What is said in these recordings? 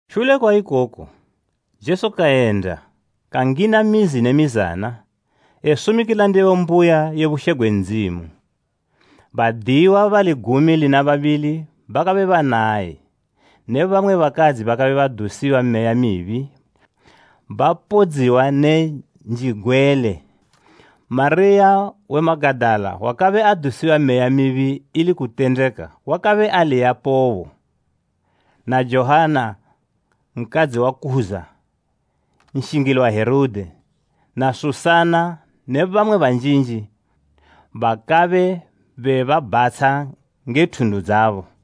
Shule kwa ikoku, Jesu kayenda, kangina mizi ne mizana, esumikila ndebo mbuya ye bushe gwe Ndzimu. Badiyiwa bali gumi lina babili bakabe banaye, ne bamwe bakadzi bakabe badusiwa meya mibi bapodziwa ne njigwele. Mariya we Magadala wakabe adusiwa meya mibi ili kutendeka wakabe aliyapobo, na Joanna nkadzi wa Kuza, nshingili wa Herode, na Susana ne bamwe banjinji bakabe bebabhatsha nge thundu dzabo.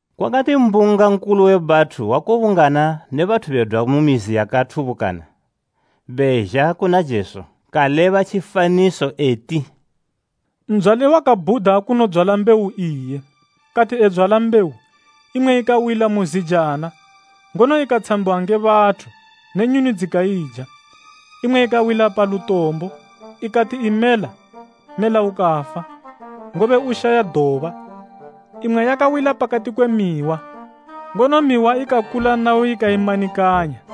Kwakati mbunga nkulu we bathu wakubungana ne bathu bedwa ku mizi yakathubukana bezha kuna Jesu, kaleba tjifaniso eti: “Ndzwali wakabhuda kunodzwala mbewu iye. Kati edzwala mbewu, imwe ikawila mu zijana, ngono ikatshambiwa nge bathu ne nyuni dzikaija. Imwe yakawila pa lutombo, ikati imela, mmela ukafa, ngobe ushaya doba. Imwe yakawila pakati kwe mihwa, ngono mihwa ikakula nayo ikaimanikanya.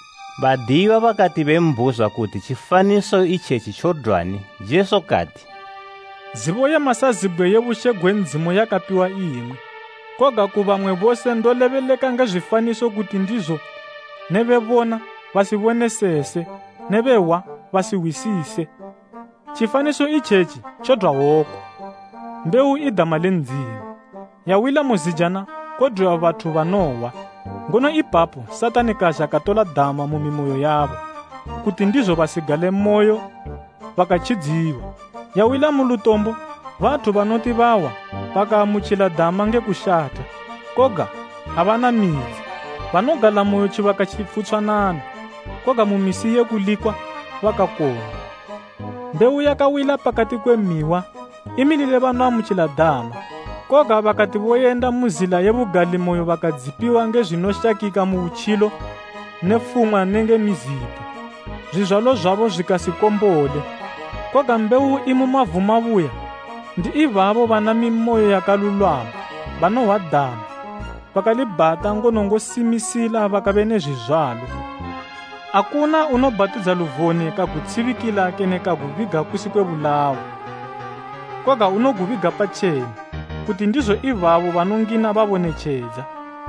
Badiyiwa bakati bembhuzwa kuti tjifaniso itjetji tjodwani, Jesu kati, “Zibo ye masazibgwe ye bushe gwe Ndzimu yakapiwa imwi, koga ku bamwe bose ndolebeleka nge zwifaniso kuti ndizo, “ ‘Ne bebona, basibonesese ne behwa basihwisise.’” “Tjifaniso itjetji tjodwa woku: Mbewu i dama le Ndzimu. Yawila mu zijana kodwiwa bathu banohwa, ngono ipapo Satani kazha katola dama mu mimoyo yabo, kuti ndizo basigalemoyo bakatjidziwa. Yawila mu lutombo bathu banoti bahwa, bakaamutjila dama nge kushatha, koga abana midzi. Banogalamoyo tjibaka tjifutshwanana, koga mu misi ye kulikwa bakakong'wa. Mbewu yakawila pakati kwe mihwa, imilile banoamutjila dama, koga bakati boyenda mu zila ye bugalimoyo bakadzipiwa nge zwinoshakika mu butjilo ne fumwa nenge mizipo, zwizwalo zwabo zwikasikombole. Koga mbewu imu mavu mabuya, ndi ibabo bana mimoyo yakalulwama, banohwa dama, bakalibhata ngono ngosimisila bakabe ne zwizwalo.” “Akuna unobhatidza luvone kagutshibikila kene kagubiga kusi kwe bulawo. Koga unogubiga patjena, kuti ndizo ibabo banongina babone tjedza.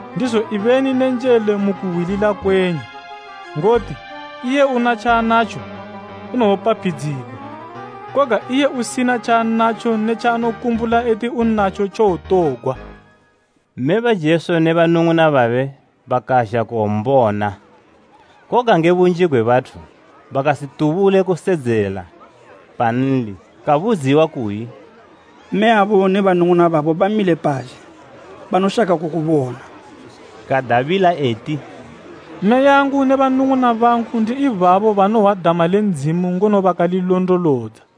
“Ndizo ibeni ne njele mu kuhwilila kwenyu. Ngoti iye una tjaanatjo unowopaphidzigwa, koga iye usina tjaanatjo ne tjaanokumbula eti unatjo tjowotogwa.” Mme ba Jesu ne banung'una babe bakazha kuwombona, koga nge bunji gwe bathu bakasitubule kusedzela panli. Kabudziwa kuyi “Mme yabo ne banung'una babo bamile pazhe, banoshaka kukubona.” Kadabila eti, “Mmeyangu ne banung'una bangu ndi ibabo banohwa dama le Ndzimu ngono bakalilondolodza.”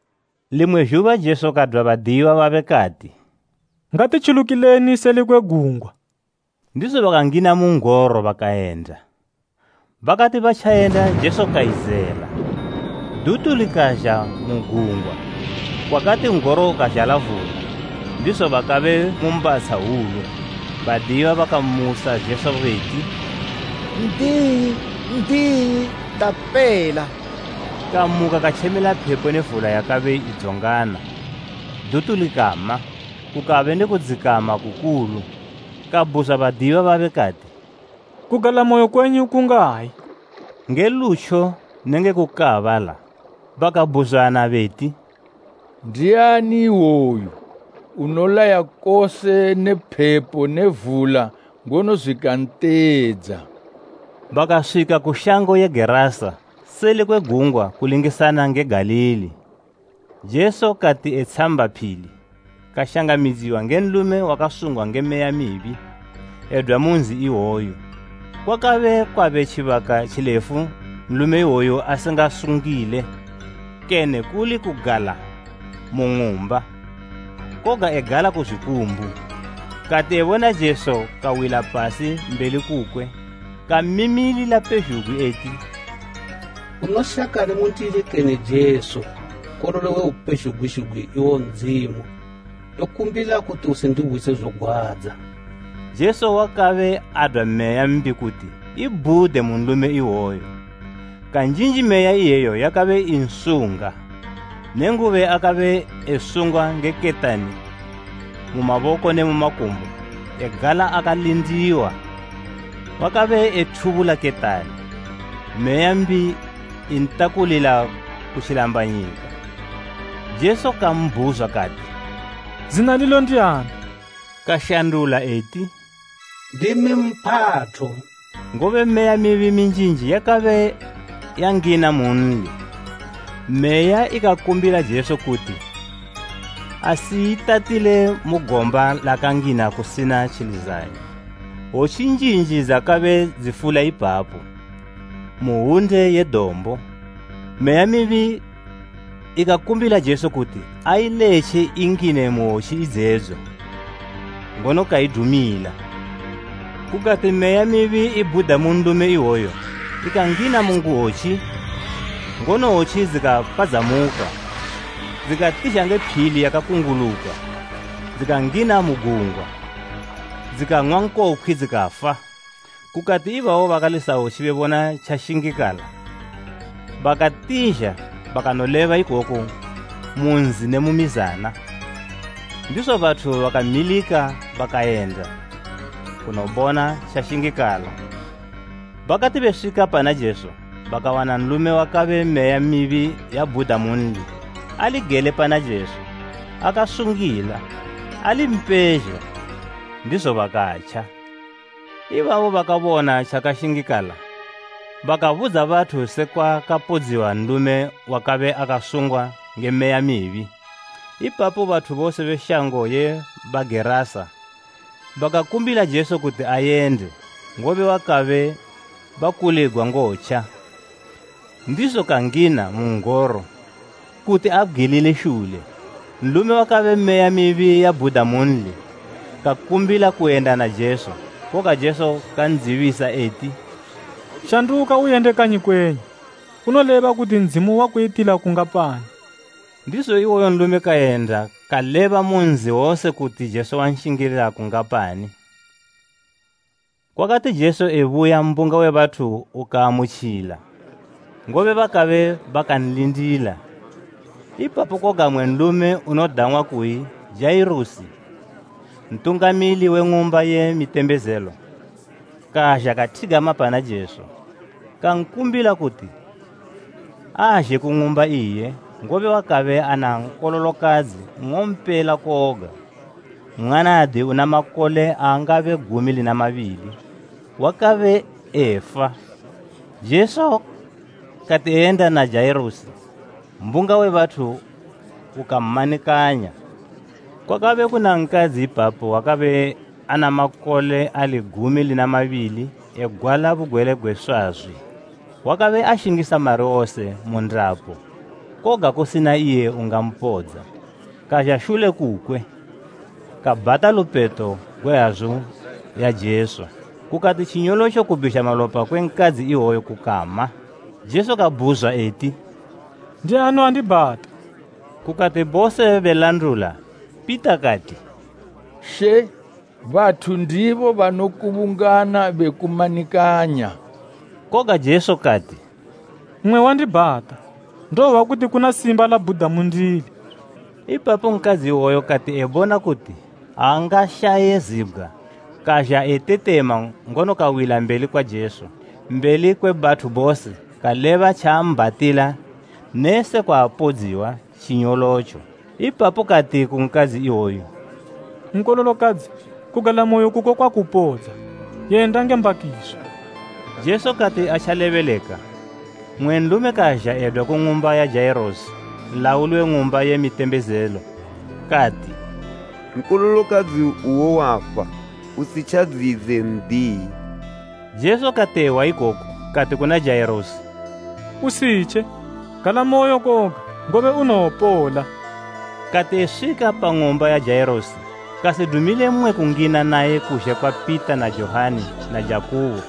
Limwe zhuba Jesu kadwa badiyiwa babe, kati “Ngati tjulukileni seli kwe gungwa.” Ndizo bakangina mu n'goro bakayenda. Bakati batjayenda Jesu kayizela. Dutu likazha mu gungwa, kwakati n'goro ukazhala vula, ndizo bakabe mu mbatsha hwulu. Badiyiwa bakamusa Jesu beti, “N'diyi, N'diyi, tapela!” Kamuka katjemela phepo ne vula yakabe idzongana, dutu likama, kukabe ne kudzikama kukulu. Kabhuzwa badiyiwa babe kati, “Kugalamoyo kwenyu kungayi?” Nge lutjo nenge kukaabala, bakabhuzwana beti, “Ndiani iwoyu? Unolaya kose ne phepo ne vula ngono zwikanteedza.” Bakaswika ku shango ye Gerasa, seli kwe gungwa kulingisana nge Galili. Jesu kati etshamba phili, kashangamidziwa nge nlume wakasungwa nge meya mbi, edwa mu nzi iwoyu. Kwakabe kwabe tjibaka tjilefu nlume iwoyu asingasungile, kene kuli kugala mu ng'umba, koga egala ku zwikumbu. Kati ebona Jesu kawila pasi mbeli kukwe kamimilila pezhugwi eti, “Unoshakani mundili kene Jesu, Nkololo we Upezhugwi zhugwi iwo Ndzimu? Ndokukumbila kuti usindihwise zogwadza.” Jesu wakabe adwa meya mbi kuti ibhude mu nlume iwoyo. Kanjinji meya iyeyo yakabe insunga, nenguba akabe esungwa nge ketani mu maboko ne makumbo egala akalindiwa, wakabe ethubula ketani, meya mbi entakulila ku tjilambanyika. Jesu kambhuzwa kati, “Zina lilo ndiani?” Kashandula eti, “Ndimi Mphatho,” ngobe meya mibi minjinji yakabe yangina munli. Meya ikakumbila Jesu kuti asiyitatile mu gomba lakangina kusina tjilizanyo. Hwotji njinji dzakabe dzifula ipapo, mu hwunde ye dombo. Meya mibi ikakumbila Jesu kuti ailetje ingine mu hwotji idzedzo, ngono kaidumila. Kukati meya mibi ibhuda mu nlume iwoyu ikangina mu hwotji ngono hwotji dzikapadzamuka dzikatizha nge phili yakakunguluka, dzikangina mu gungwa, dzikang'wa nkokhwi dzikafa. Kukati ibabo bakalisa hwotji bebona tjashingikala, bakatizha bakanoleba ikoku mu nzi ne mu mizana, ndizo bathu bakamilika bakayenda, kunobona tjashingikala. Bakati beswika pana Jesu, bakawana nlume wakabe meya mibi yabhuda munli, ali gele pana Jesu, akasungila, ali mpezha, ndizo bakatja. Ibabo bakabona tjakashingikala bakabudza bathu sekwa kapodziwa nlume wakabe akasungwa nge meya mibi. Ipapo bathu bose be shango ye Bagerasa bakakumbila Jesu kuti ayende, ngobe bakabe bakuligwa ngotja. Ndizo kangina mu n'goro kuti abgwilile shule. Nlume wakabe meya mibi yabhuda munli, kakumbila kuyenda na Jesu, koga Jesu kandzibisa eti, “Shanduka uyende kanyi kwenyu, unoleba kuti Ndzimu wakuyitila kungapani.” Ndizo iwoyo nlume kayenda kaleba mu nzi wose kuti Jesu wanshingila kungapani. Kwakati Jesu ebuya mbunga we bathu ukan'amutjila, ngobe bakabe bakanlindila. Ipapo koga mmwe nlume unodang'wa kuyi Jairusi, ntungamili we ng'umba ye mitembezelo, kazha kathigama pana Jesu, kankumbila kuti azhe ku ng'umba iye, ngobe wakabe ana nkololokadzi nng'ompela koga, mwanadi una makole angabe gumi lina mabili, wakabe efa. Jesu kati eyenda na Jairusi, mbunga we bathu ukammanikanya. Kwakabe kuna nkadzi ipapo wakabe ana makole ali gumi lina mabili egwala bugwele gwe swazwi. Wakabe ashingisa mari wose mu ndapo, koga kusina iye ungampodza. Kazha shule kukwe, kabhata lupeto gwe hazu ya Jesu, kukati tjinyolotjo kubhizha malopa kwe nkadzi iwoyo kukama. Jesu kabhuzwa eti, “Ndiani wandibhata?” Kukati bose belandula, Pita kati, “She, bathu ndibo banokubungana bekumanikanya.” Koga Jesu kati, “Mmwe wandibhata; ndohwa kuti kuna simba labhuda mundili.” Ipapo nkadzi iwoyo kati ebona kuti angashaye zibgwa, kazha etetema ngono kawila mbeli kwa Jesu, mbeli kwe bathu bose kaleba tjaambhatila ne sekwa apodziwa tjinyolotjo. Ipapo kati ku nkadzi iwoyu “Nkololokadzi kugalamoyo kuko kwakupodza. Yenda nge mbakiso.” Jesu kati atjalebeleka, mmwe nlume kazha edwa ku ng'umba ya Jairusi, nlauli we ng'umba ye mitembezelo kati, “Nkololokadzi uwo wafa, usitjadziyidze n'diyi.” Jesu kati ehwa ikoku kati kuna Jairusi, “Usitje, galamoyo koga, ngobe unowopola.” Kati eswika pa ng'umba ya Jairusi, kasidumile mmwe kungina naye kuzhe kwa Pita na Johani na Jakubo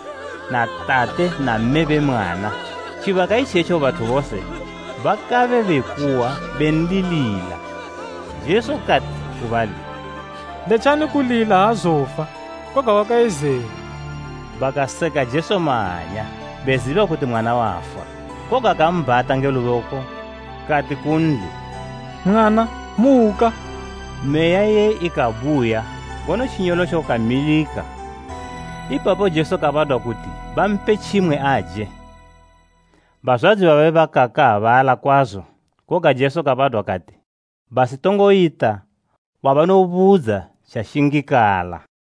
na tate na mme be mwana. Tjibaka itjetjo bathu bose bakabe bekuwa benlilila. Jesu kati, ku bali “Letjani kulila aazofa, koga wakayizela.” Bakaseka Jesu mahanya, beziba kuti mwana wafa. Koga kambhata nge luboko, kati kunli, “Mwana, muka!” Meya iye ikabuya, ngono tjinyolotjo kamilika. Ipapo Jesu kabadwa kati bampe tjimwe aje. Bazwadzi babe bakakaabala kwazo, koga Jesu kabadwa kati basitongoyita wabanobudza tjashingikala.